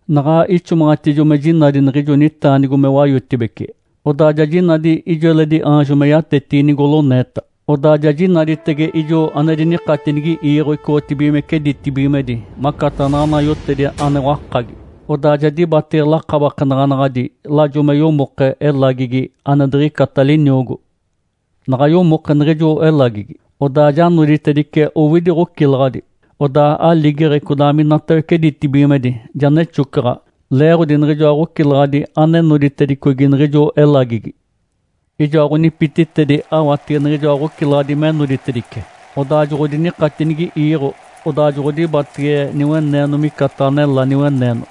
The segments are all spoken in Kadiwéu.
Naɡ̶a ixomaɡ̶atijo me jinadi niɡ̶ijo nitaanigo me wayotibece, odaa ja jinadi ijo eledi aanjo me yatetigi nigoloneeta. Odaa ja jinaditege ijo ane dinikatinigi iiɡ̶o icoɡ̶otibigimece ditibigimedi macataɡ̶a naɡ̶ana yotedi ane wakagi. Odaa ja dibatege lakabakenaɡ̶anaɡ̶adi lajo me yomoke elagigi ane diɡ̶icata liniogo. Naɡ̶a yomoke niɡ̶ijo elagigi, odaa ja noditedice owidi ɡ̶ocilaɡ̶adi. Odaa aligeɡ̶e codaa minatawece ditibigimedi ja nexocaɡ̶a leeɡ̶odi niɡ̶ijoa ɡ̶ocilaɡ̶adi ane noditedicogi niɡ̶ijo elagigi. Ijoa ɡ̶onipititedi awatege niɡ̶ijoa ɡ̶ocilaɡ̶adi me noditedice, odaa joɡ̶odinikatinigi iiɡ̶o. Odaa joɡ̶odibatege niweneeno micataɡ̶a nelá niweneeno.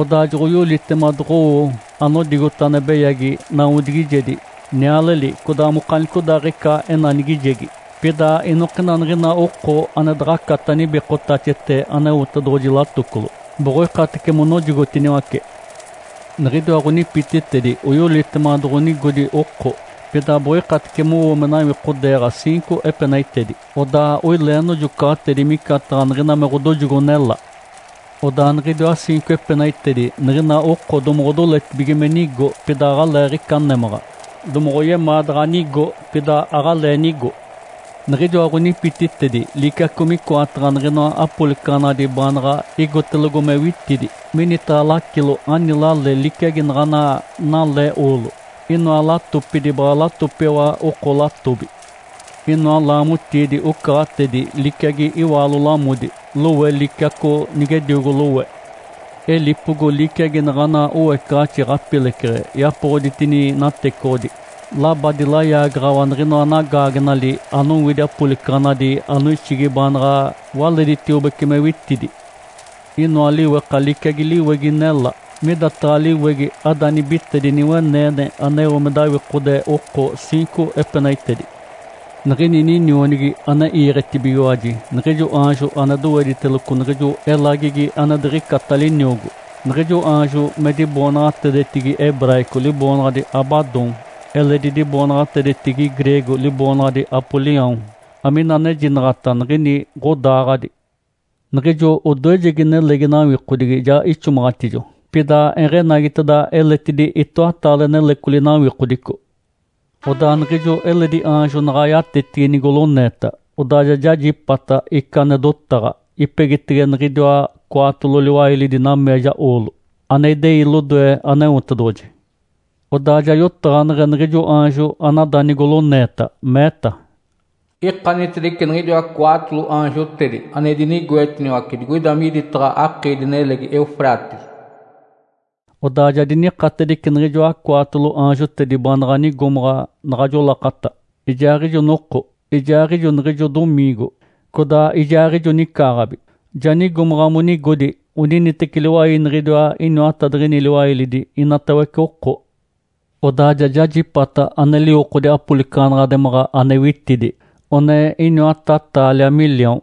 Odaa joɡ̶oyolitema doɡ̶owo anodigota ane beyagi nawodigijedi, nialeli, codaa mokanicodaaɡ̶ica enanigijegi. Pida inokina niɡ̶ina oko ane daɡ̶acata nibikotaxete Aneotedoɡ̶oji latocolo, boɡ̶oikatece monojogotiniwace. Niɡ̶idiwa ɡ̶onipititedi oyolitema doɡ̶onigodi oko, pida boɡ̶oikatece mowo me nawikodeeɡ̶a ciinco epenaitedi. Odaa oilee nojocaɡ̶atedi micataɡ̶a niɡ̶ina me ɡ̶odojogo nelá. Odaa niɡ̶idiwa ciinco epenaitedi niɡ̶ina oko domoɡ̶odoletibige me nigo, pida aɡ̶aleeɡ̶ica némaɡ̶a. Domoɡ̶oyemaa daɡ̶a nigo, pida aɡ̶alee nigo. Niɡ̶ijoa ɡ̶onipititedi liciaco micoataɡ̶a niɡ̶inoa apolicaɡ̶anadi baanaɡ̶a igotelogo me witidi. Minitaɡ̶a lacilo ani lale liciagi naɡ̶ana nale oolo. Inoa latopidi baɡ̶a latopiwa oko latobi. Inoa laamotiidi ocaɡ̶atedi liciagi iwaalo lamodi, lowe liciaco nigediogo lowe. Elipogo liciagi naɡ̶ana oecaɡ̶axi ɡ̶apileceɡ̶e yapoɡ̶oditini natecoɡ̶odi. Labadi layaagaɡ̶awa niɡ̶inoa nagaagenali anowidi apolicaɡ̶anadi anoixigi baanaɡ̶a waleditiobece me witidi. Inoa liweka liciagi liwegi nelá. Midataɡ̶a liwegi ada nibite diniweneene aneo me dawikode oko ciinco epenaitedi. Niɡ̶ini ninionigi ane iiɡ̶etibigiwaji, niɡ̶ijo aanjo ane dowediteloco niɡ̶ijo elagigi ane diɡ̶icata liniogo. Niɡ̶ijo aanjo me diboonaɡ̶atedetigi “hebraico” liboonaɡ̶adi “Abadom”, eledi diboonaɡ̶atedetigi “greego” liboonaɡ̶adi “Apolião”, amina anejinaɡ̶ata “Niɡ̶ini ɡ̶odaaɡ̶adi.” Niɡ̶ijo odoejegi nelegi nawikodigi ja ixomaɡ̶atijo. Pida eɡ̶enagiteda eletidi itoataale nelecoli nawikodico. Odaa niɡ̶ijo eledi aanjo naɡ̶a yatetigi nigoloneeta, odaa ja jajipata ica ane dotaɡ̶a, ipegitege niɡ̶idiwa cwaatolo liwailidi nameeja oolo, ane idei lodoe Aneotedoɡ̶oji. Odaa ja yotaɡ̶aneɡ̶e niɡ̶ijo aanjo anada nigoloneeta, meeta, “Ikanitedice niɡ̶idiwa cwaatolo aanjotedi ane dinigoetiniwace digoida miditaɡ̶a akiidi-nelegi Eufrates.” Odaa ja dinikatedice niɡ̶ijoa cwaatolo aanjotedi baanaɡ̶a nigomaɡ̶a naɡ̶ajo lakata, ijaaɡ̶ijo noko, ijaaɡ̶ijo niɡ̶ijo domiingo, codaa ijaaɡ̶ijo nicaaɡ̶abi. Ja nigomaɡ̶a monigodi oniniteci liwai niɡ̶idiwa iniwatadiɡ̶ini liwailidi inatawece oko. Odaa ja jajipata ane liwokodi apolicaɡ̶anaɡ̶ademaɡ̶a ane witidi, one iniwata taalia miliaon.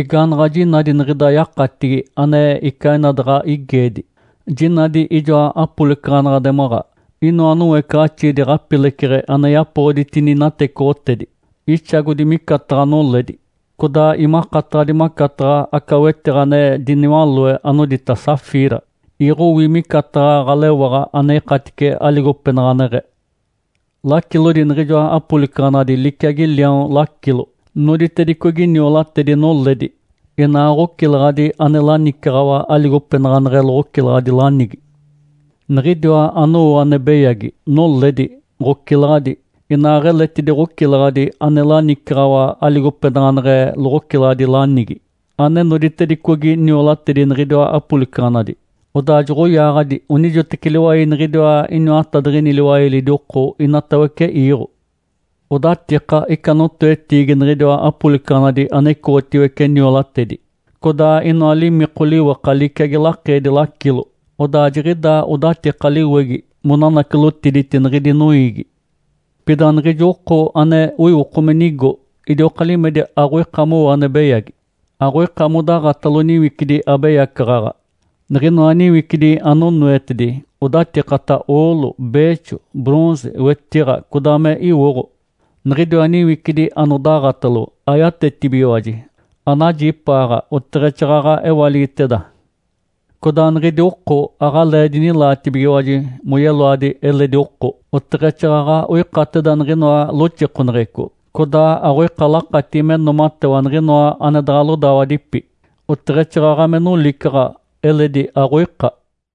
Igaanaɡ̶a jinadi niɡ̶ida yakatigi ane icaa ina daɡ̶a igeedi, jinadi ijoa apolicaɡ̶anaɡ̶ademaɡ̶a. Inoa noecaɡ̶axiidi ɡ̶apileceɡ̶e ane yapoɡ̶oditini natecoɡ̶otedi, ixagodi micataɡ̶a noledi, codaa imakataɡ̶adi macataɡ̶a aca wetiɡ̶a ane diniwaloe, anodita “safira”, iɡ̶owi micataɡ̶a ɡ̶alewaɡ̶a ane ikatice aligopenaɡ̶aneɡ̶e. Lacilodi niɡ̶ijoa apolicaɡ̶anadi liciagi liaon lacilo. Noditedicogi niolatedi noledi, inaa ɡ̶ocilaɡ̶adi ane lanicaɡ̶awa aligopenaɡ̶aneɡ̶e loɡ̶ocilaɡ̶adi lanigi. Niɡ̶idiwa anowo ane beyagi: Noledi, ɡ̶ocilaɡ̶adi, inaaɡ̶eletidi ɡ̶ocilaɡ̶adi ane lanicaɡ̶awa aligopenaɡ̶aneɡ̶e loɡ̶ocilaɡ̶adi lanigi, ane noditedicogi niolatedi niɡ̶idiwa apolicaɡ̶anadi, odaa joɡ̶oyaaɡ̶adi onijoteci liwai niɡ̶idiwa iniwatadiɡ̶ini liwailidi oko inatawece iiɡ̶o. Odatika ica notoetiigi niɡ̶idiwa apolicaɡ̶anadi ane icoɡ̶otiwece niolatedi, codaa inoa limiko liweka liciagi lakeedi lacilo. Odaa jiɡ̶idaa odatika liwegi monanacilotiditi niɡ̶idi noiigi. Pida niɡ̶ijo oko ane iwoko me nigo idioka limedi aɡ̶oika mowo ane beyagi. Aɡ̶oika modaɡ̶atalo niwicidi abeyacaɡ̶aɡ̶a, niɡ̶inoa niwicidi anonoetedi odatikata oolo, beexo, “bronze”, wetiɡ̶a, codaa me iwoɡ̶o. Niɡ̶idiwa niwicidi anodaɡ̶atalo ayatetibigiwaji, anajipaaɡ̶a oteɡ̶exaaɡ̶aɡ̶a ewaligiteda. Codaa niɡ̶idi oko aɡ̶alee dinilaatibigiwaji moyeloadi eledi oko, oteɡ̶exaaɡ̶aɡ̶a oikateda niɡ̶inoa loxikoneɡ̶eco, codaa aɡ̶oika lakatigi me noomatewa niɡ̶inoa ane daɡ̶a lodawadipi, oteɡ̶exaaɡ̶aɡ̶a me nolicaɡ̶a eledi aɡ̶oika.